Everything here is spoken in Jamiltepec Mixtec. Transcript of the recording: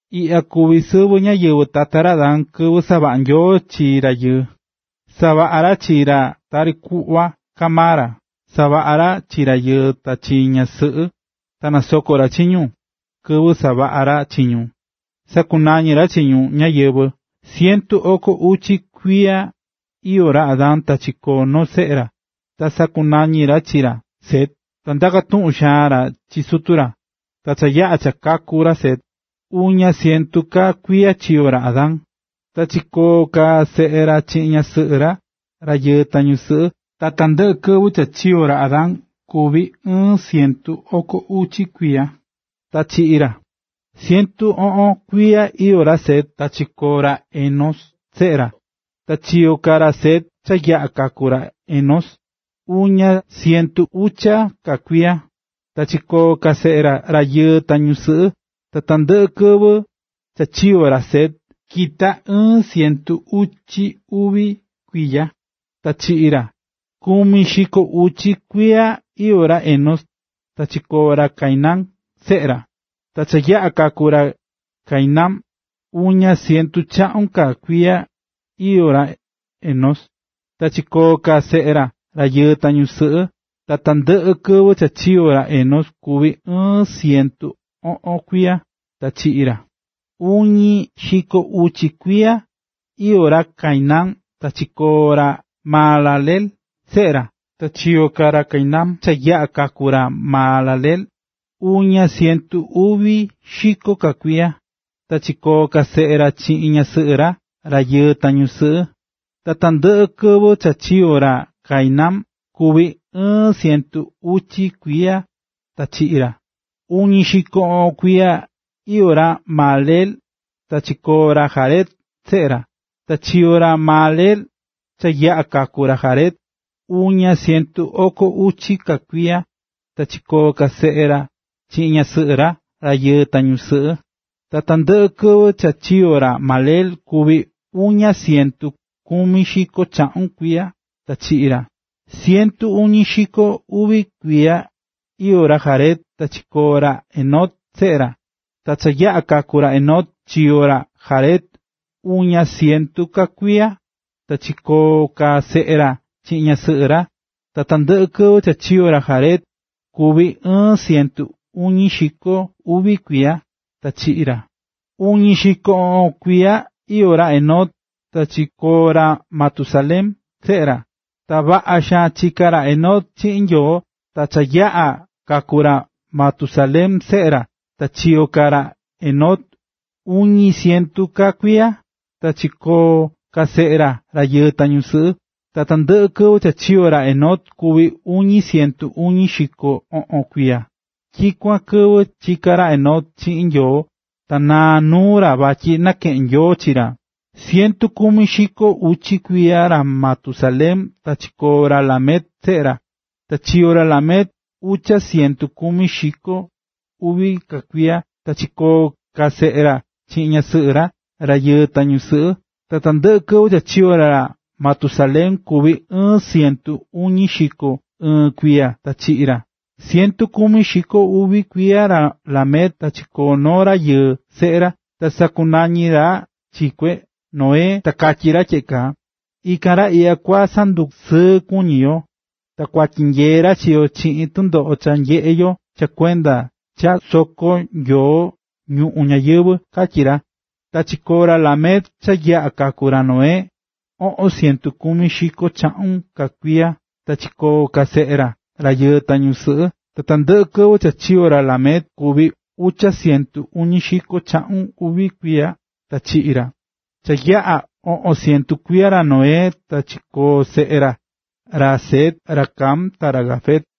Iꞌya kuví sɨvɨ ñáyɨvɨ tata ra Adán. Kɨvɨ savaꞌa̱ Nyoo chi rayɨɨ, savaꞌa̱ ra chi ra tari kuꞌva kaá maa ra. Savaꞌa̱ ra chi rayɨɨ ta chi ñaꞌan sɨꞌɨ, ta nasoko̱ ra chi ñu. Kɨvɨ savaꞌa̱ ra chi ñu, sakunañi̱ ra chi ñu “ñáyɨvɨ”. Cientu oko uchi kuiya iyó ra Adán ta chikoo̱ noo seꞌe ra, ta sakunañi̱ ra chi ra, Set, ta ndakú xaan ra chi sutu ra. Ta cha yaꞌa̱ cha kaku̱ ra Set, uña cientu ka kuiya chiyo̱ ra Adán, ta chikoo̱ ka seꞌe ra chiꞌin ñasɨꞌɨ ra, rayɨɨ ta ñusɨꞌɨ. Ta tandɨꞌɨ kɨvɨ cha chiyo̱ ra Adán kuvi̱ ɨɨn cientu oko uchi kuiya, ta chiꞌi̱ ra. Cientu oꞌon kuiya iyó ra Set, ta chikoo̱ ra Enós, seꞌe ra. Ta chiyo̱ ka ra Set, cha yaꞌa̱ kaku̱ ra Enós, uña cientu ucha ka kuiya, ta chikoo̱ ka seꞌe ra, rayɨɨ ta ñusɨꞌɨ. Ta tandɨꞌɨ kɨvɨ cha chiyo̱ ra Set, kita̱ ɨɨn cientu uchi uvi kuiya, ta chiꞌi̱ ra. Kumi xiko uchi kuiya iyó ra Enós, ta chikoo̱ ra Cainán, seꞌe ra. Ta cha yaꞌa̱ kaku̱ ra Cainán, uña cientu chaꞌun ka kuiya iyó ra Enós, ta chikoo̱ ka seꞌe ra, rayɨɨ ta ñusɨꞌɨ. Ta tandɨꞌɨ kɨvɨ cha chiyo̱ ra Enós kuvi̱ ɨɨn cientu oꞌon kuiya, ta chiꞌi̱ ra. Uñi xiko uchi kuiya iyó ra Cainán, ta chikoo̱ ra Mahalaleel, seꞌe ra. Ta chiyo̱ ka ra Cainán, cha yaꞌa̱ kaku̱ ra Mahalaleel, uña cientu uvi xiko ka kuiya, ta chikoo̱ ka seꞌe ra chiꞌin ñasɨꞌɨ ra, rayɨɨ ta ñusɨꞌɨ. Ta tandɨꞌɨ kɨvɨ cha chiyo̱ ra Cainán kuvi̱ ɨɨn cientu uchi kuiya ta chiꞌi̱ ra. Uñi xiko oꞌon kuiya iyó ra Mahalaleel ta chikoo̱ ra Jared, seꞌe ra. Ta chiyo̱ ra Mahalaleel, cha yaꞌa̱ kaku̱ ra Jared, uña cientu oko uchi ka kuiya, ta chikoo̱ ka seꞌe ra chiꞌin ñasɨꞌɨ ra, rayɨɨ ta ñusɨꞌɨ. Ta tandɨꞌɨ kɨvɨ cha chiyo̱ ra Mahalaleel kuvi̱ uña cientu kumi xiko chaꞌun kuiya, ta chiꞌi̱ ra. Cientu uñi xiko uvi kuiya iyó ra Jared, ta chikoo̱ ra Enoc, seꞌe ra. Ta cha yaꞌa̱ kaku̱ ra Enoc, chiyo̱ ra Jared uña cientu ka kuiya, ta chikoo̱ ka seꞌe ra chiꞌin ñasɨꞌɨ ra. Ta tandɨꞌɨ kɨvɨ cha chiyo̱ ra Jared kuvi̱ ɨɨn cientu uñi xiko uvi kuiya, ta chiꞌi̱ ra. Uñi xiko oꞌon kuiya iyó ra Enoc, ta chikoo̱ ra Matusalén, seꞌe ra. Ta vaꞌa xaan chiká ra Enoc chiꞌin Nyoo. Ta cha yaꞌa̱ kaku̱ ra Matusalén, seꞌe ra, ta chiyo̱ ka ra Enoc uñi cientu ka kuiya, ta chikoo̱ ka seꞌe ra, rayɨɨ ta ñusɨꞌɨ. Ta tandɨꞌɨ kɨvɨ cha chiyo̱ ra Enoc kuvi̱ uñi cientu uñi xiko oꞌon kuiya. Tyikuan kɨvɨ chika̱ ra Enoc chiꞌin Nyoo, ta naa̱ nuu ra vatyi nakeꞌe̱n Nyoo chi ra. Cientu kumi xiko ucha kuiya ra Matusalén ta chikoo̱ ra Lamec, seꞌe ra. Ta chiyo̱ ra Lamec ucha cientu kumi xiko uvi ka kuiya, ta chikoo̱ ka seꞌe ra chiꞌin ñasɨꞌɨ ra, rayɨɨ ta ñusɨꞌɨ. Ta tandɨꞌɨ kɨvɨ cha chiyo̱ ra Matusalén kuvi̱ ɨɨn cientu uñi xiko ɨɨn kuiya; ta chiꞌi̱ ra. Cientu kumi xiko uvi kuiya ra Lamec ta chikoo̱ noo rayɨɨ seꞌe ra. Ta sakunañi̱ ra chi kue, Noé, ta katyí ra tyeꞌe kaa: “Ikan ra iꞌya kusandusɨɨ kuñi yo, ta kua tyinyee ra chi yo chiꞌin tɨndoꞌo cha nyeꞌé yo cha kuenda cha soko̱ Nyoo ñuꞌún ñayɨvɨ̱”, katyí ra. Chiyo̱ ra Lamec, cha yaꞌa̱ kaku̱ ra Noé, oꞌon cientu kumi xiko chaꞌun ka kuiya, ta chikoo̱ ka seꞌe ra, rayɨɨ ta ñusɨꞌɨ. Ta tandɨꞌɨ kɨvɨ cha chiyo̱ ra Lamec kuvi̱ ucha cientu uñi xiko chaꞌun uvi kuiya, ta chiꞌi̱ ra. Cha yaꞌa̱ oꞌon cientu kuiya ra Noé, ta chikoo̱ seꞌe ra, ra Sem, ra Cam ta ra Jafet.